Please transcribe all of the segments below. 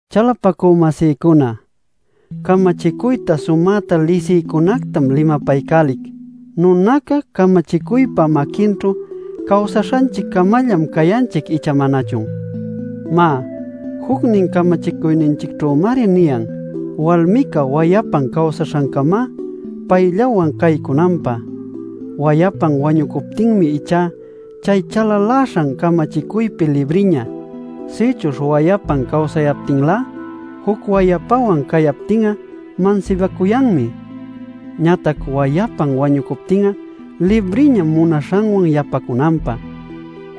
Chalapacü-masïcuna, camachicuyta sumäta lisïcunactam limapaycälic. ¿Nunaca camachicuypa maquinćhu cawsaśhanchiccamallam cayanchic icha manachun? Má, jucnin camachicuyninchicćhümari niyan walmica wayapan cawsaśhancamá payllawan caycunanpä. Wayapan wañucuptinmi ichá chay chalaläśhan camachicuypi libriña. Sïchuśh wayapan cawsayaptinlä juc wayapawan cayaptin'a mansibacuyanmi. Ñatac wayapan wañucuptin'a libriñam munaśhanwan yapacunanpä;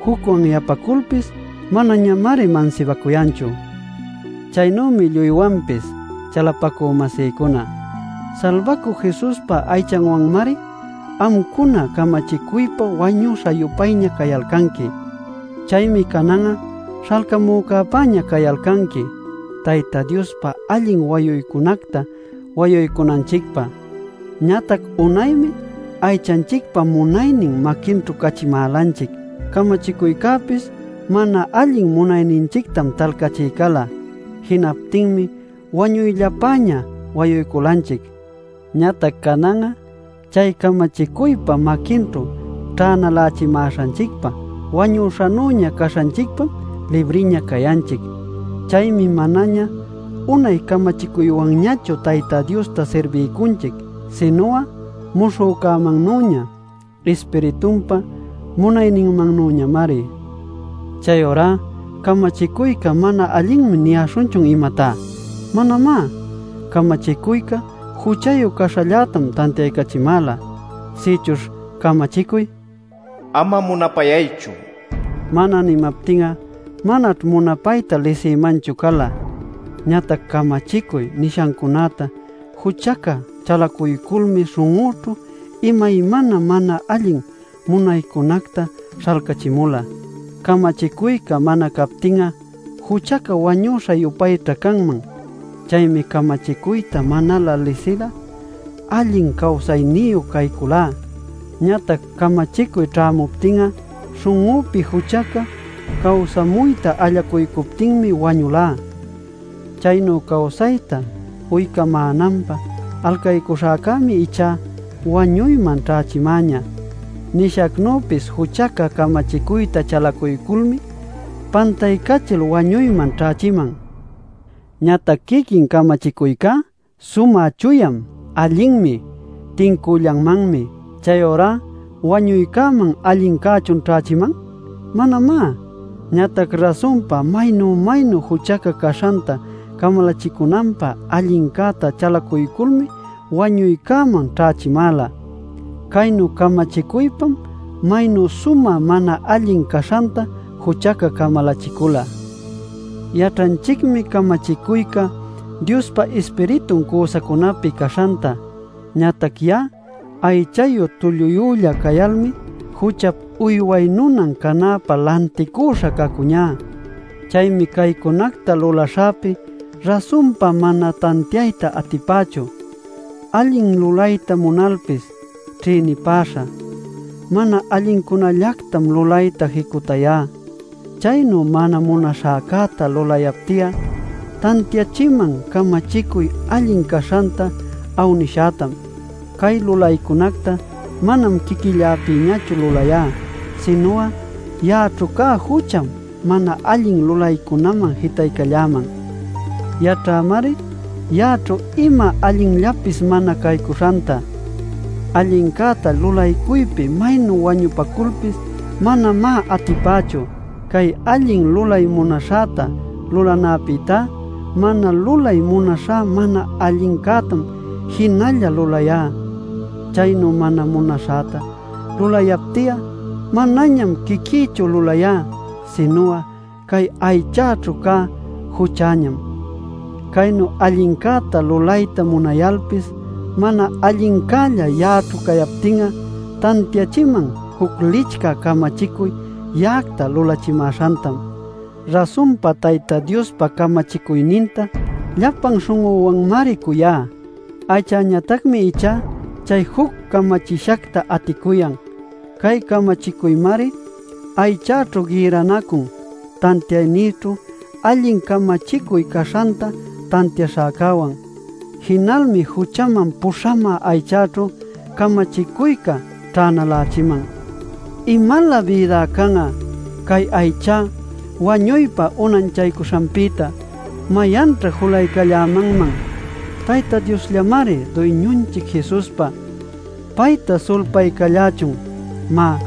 jucwan yapaculpis manañamari mansibacuyanchu. Chaynümi lluywanpis, chalapacü-masïcuna. Salbacü Jesuspa aychanwanmari amcuna camachicuypä wañuśha-yupayña cayalcanqui. Chaymi canan'a śhalcamücäpäña caycälinqui, Tayta Diospa allin wayuycunacta wayuycunanchicpä. Ñatac unaymi aychanchicpa munaynin maquinćhu cachimälanchic. Camachicuycäpis mana allin munayninchictam talcachï cala. Jinaptinmi wañuyllapäña wayuyculanchic. Ñatac canan'a chay camachicuypa maquinćhu ćhänalächimäśhanchicpá wañüśhanüña caśhanchicpam libriña cayanchic. Chaymi manaña unay camachicuywanñachu Tayta Diosta sirbiycunchic, sinu'a muśhü cämannüña, Ispiritunpa munayninmannüñamari. Chayurá ¿“Camachicuyca mana allinmi” niyäśhunchun, imatá? ¡Manamá! Camachicuyca juchayu caśhallätam tantiaycachimäla. Sïchuśh camachicuy “Ama munapayaychu” mana nimaptin'a manaćh munapayta lisïmanchu cala. Ñatac camachicuy nishancunacta juchaca chalacuyculmi śhun'üćhu imaymana mana allin munaycunacta śhalcachimula. Camachicuyca mana captin'a juchaca wañüśha-yupayćha canman. Chaymi camachicuyta manalä lisil'a allin cawsayniyu cayculá. Ñatac camachicuy ćhämuptin'a śhun'üpi juchaca cawsamuyta allacuycuptinmi wañülá. Chaynu cawsayta uycamänanpä alcaycuśhäcämi ichá wañuyman ćhächimäñä. Nishacnüpis juchaca camachicuyta chalacuyculmi pantaycachil wañuyman ćhächiman. Ñatac quiquin camachicuycá sumä chuyam, allinmi, tincüllanmanmi. Chayurá ¿wañuycäman allincächun ćhächiman? ¡Manamá! Ñatac rasunpa maynu-maynu juchaca caśhanta camalachicunanpä allincäta chalacuyculmi wañuycäman ćhächimäla. Caynu camachicuypam maynu sumä mana allin caśhanta juchaca camalachicula. Yaćhanchicmi camachicuyca Diospa Ispiritun cüsacunapi caśhanta. Ñatac ya'a aychayu tulluyülla cayalmi juchap uyway nunan canäpä lanticüśha cacuñá. Chaymi caycunacta lulaśhäpi rasunpa mana tantiayta atipächu. Allin lulayta munalpis ćhïnipäśhá mana allincunällactam lulayta jicutayá. Chaynu mana munaśhäcäta lulayapti'a tantiachiman camachicuy allin caśhanta awnishätam. Cay lulaycunacta manam quiquilläpïñachu lulayá. Sinu'a ya'aćhu cä jucham mana allin lulaycunaman jitaycalläman. Yaćhämari ya'aćhu ima allinllapis mana caycuśhanta. Allincäta lulaycuypi maynu wañupaculpis manamá atipächu. Cay allin lulay munaśhäta lulanäpïtá, mana lulay munaśhá mana allincätam jinalla lulayá. Chaynu mana munaśhäta lulayapti'a manañam quiquïchu lulayá, sinu'a cay aychäćhu cä juchäñam. Caynu allincäta lulayta munayalpis mana allincälla ya'aćhu cayaptin'a tantiachiman juc licchä camachicuy ya'acta lulachimäśhantam. Rasunpa Tayta Diospa camachicuyninta llapan śhun'üwanmari cuyá; aychäñatacmi ichá chay juc camachishacta aticuyan. Cay camachicuymari aychäćhu gïrranacun tantiaynïćhu allin camachicuy caśhanta tantiaśhäcäwan. Jinalmi juchaman puśhamä aychäćhu camachicuyca ćhänalächiman. ¡Imalä bïdá can'a! Cay aychá wañuypä unanchaycuśhanpïta ¿mayanćha julaycallämanman? ¡Tayta Diosllamari Duyñunchic Jesuspa! ¡Payta sulpay callächun! Má,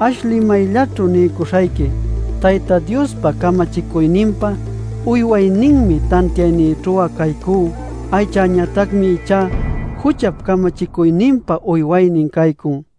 ash limayllaćhu niycuśhayqui: Tayta Diospa camachicuyninpa uywayninmi tantiaynïćhu'a caycú; aychäñatacmi ichá juchap camachicuyninpa uywaynin caycun.